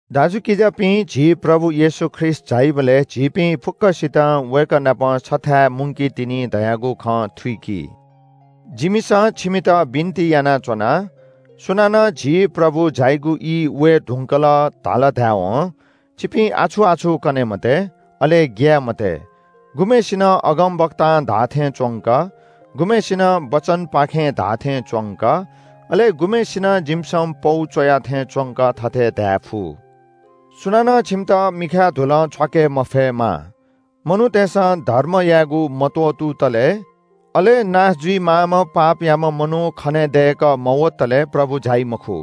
दाजुकिजापिं, झी प्रभु येशू ख्रीष्‍ट झाइबलय् झीपिं फुक्‍कसितं वय्‌कः नाप छथाय् मुंकीतिनि धयागु खँ थुइकि। जिमिसं छिमित बिन्‍ति यानाच्‍वना – सुनानं झी प्रभु झाइगु ई वये धुंकल धाल धायेवं छिपिं आछु-आछु कने मते, अले ग्‍याये मते। गुम्‍हय्‌सिनं अगमवक्तां धाःथें च्‍वंक, गुम्‍हय्‌सिनं वचनपाखें धाःथें च्‍वंक, अले गुम्‍हय्‌सिनं जिमिसं पौ च्‍वया थें च्‍वंक थथे धायेफु। सुनानं छिमित मिखाय् धुलं छ्वाके मफयेमा। मनूतय्‌सं धर्म यायेगु मत्‍वःतुतले, अले नाश जुइमाःम्‍ह पापयाम्‍ह मनू खनेदय्‌कः मवतले प्रभु झाइ मखु।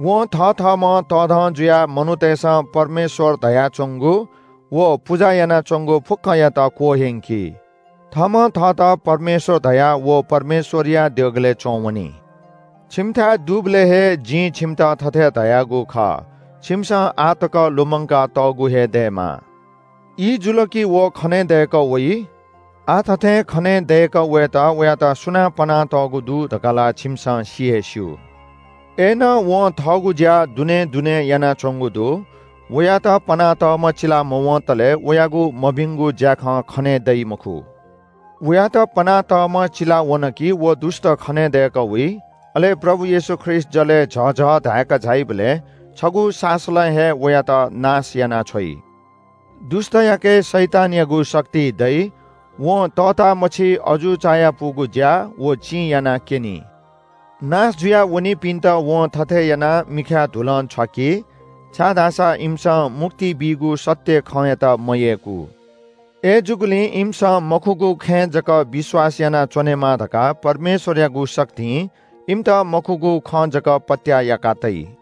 वं थथःम्‍हं तःधं जुयाः मनूतय्‌सं परमेश्‍वर धयाच्‍वंगु व पुजा यानाच्‍वंगु फुक्‍कयात क्‍वह्यंकी। थःम्‍हं थःत परमेश्‍वर धयाः व परमेश्‍वरया देगलय् च्‍वंवनी। छिमिथाय् दुबलय् हे जिं छिमित थथे धयागु खः। छिमिसं आः तक लुमंकातःगु हे दयेमाः। ई जुल कि व खनेदय्‌कः वइ। आः थथें खनेदय्‌कः वयेत वयात सुनां पनातःगु दु धकाः ला छिमिसं सि हे स्‍यू। अय्‌नं वं थःगु ज्‍या दुनें दुनें यानाच्‍वंगु दु। वयात पनातःम्‍ह चिलामवंतले वयागु मभिंगु ज्‍याखँ खने दइ मखु। वयात पनातःम्‍ह चिला वन कि व दुष्‍ट खनेदय्‌कः वइ। अले प्रभु येशू ख्रीष्‍ट जलय् झःझः धाय्‌क झाइबलय् छगू सासलं हे वयात नाश यानाछ्वइ। दुष्‍टयाके शैतानयागु शक्ति दइ। वं तःतामछि अजू चायापुगु ज्‍या व चिं यानाक्‍यनी। नाश जुया वनीपिन्‍त वं थथे यानाः मिखाय् धुलं छ्वाकि, छाय्‌धाःसा इमिसं मुक्ति बीगु सत्‍य खँयात मयय्‌कू। अय्‌जूगुलिं इमिसं मखुगु खँय् जक विश्‍वास यानाच्‍वनेमा धकाः परमेश्‍वरयागु शक्तिं इमित मखुगु खँ जक पत्‍याः याका तइ।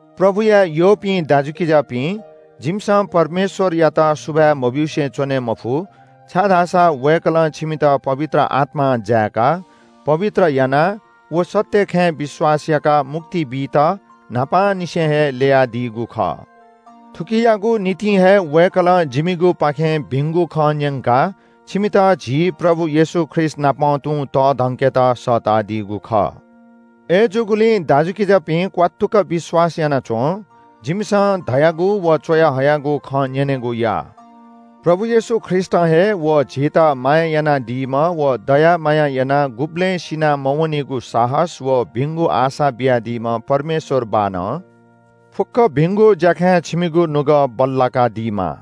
प्रभुया यःपिं दाजुकिजापिं, जिमिसं परमेश्‍वरयात सुभाय् मब्‍यूसे च्‍वने मफु, छाय्‌धाःसा वय्‌कलं छिमित पवित्र आत्‍मां जाय्‌काः पवित्र यानाः व सत्‍य खँय् विश्‍वास याकाः मुक्ति बीत न्‍हापांनिसें हे ल्‍ययादीगु खः। थुकियागु निंतिं हे वय्‌कलं जिमिगुपाखें भिंगु खँ न्‍यंकाः छिमित झी प्रभु येशू ख्रीष्‍टनापं तुं तःधंकेत सःतादीगु खः। अय्‌जूगुलिं दाजुकिजापिं क्‍वात्तुक विश्‍वास याना च्‍वँ। जिमिसं धयागु व च्‍वयाहयागु खँ न्‍यनेगु या। प्रभु येशू ख्रीष्‍टं हे व झीत माया यानादीम्‍ह व दया माया याना गुबलें सिना मवनीगु साहस व भिंगु आशा बियादीम्‍ह परमेश्‍वर बाःनं फुक्‍क भिंगु ज्‍याखँय् छिमिगु नुगः बल्‍लाकादीमा।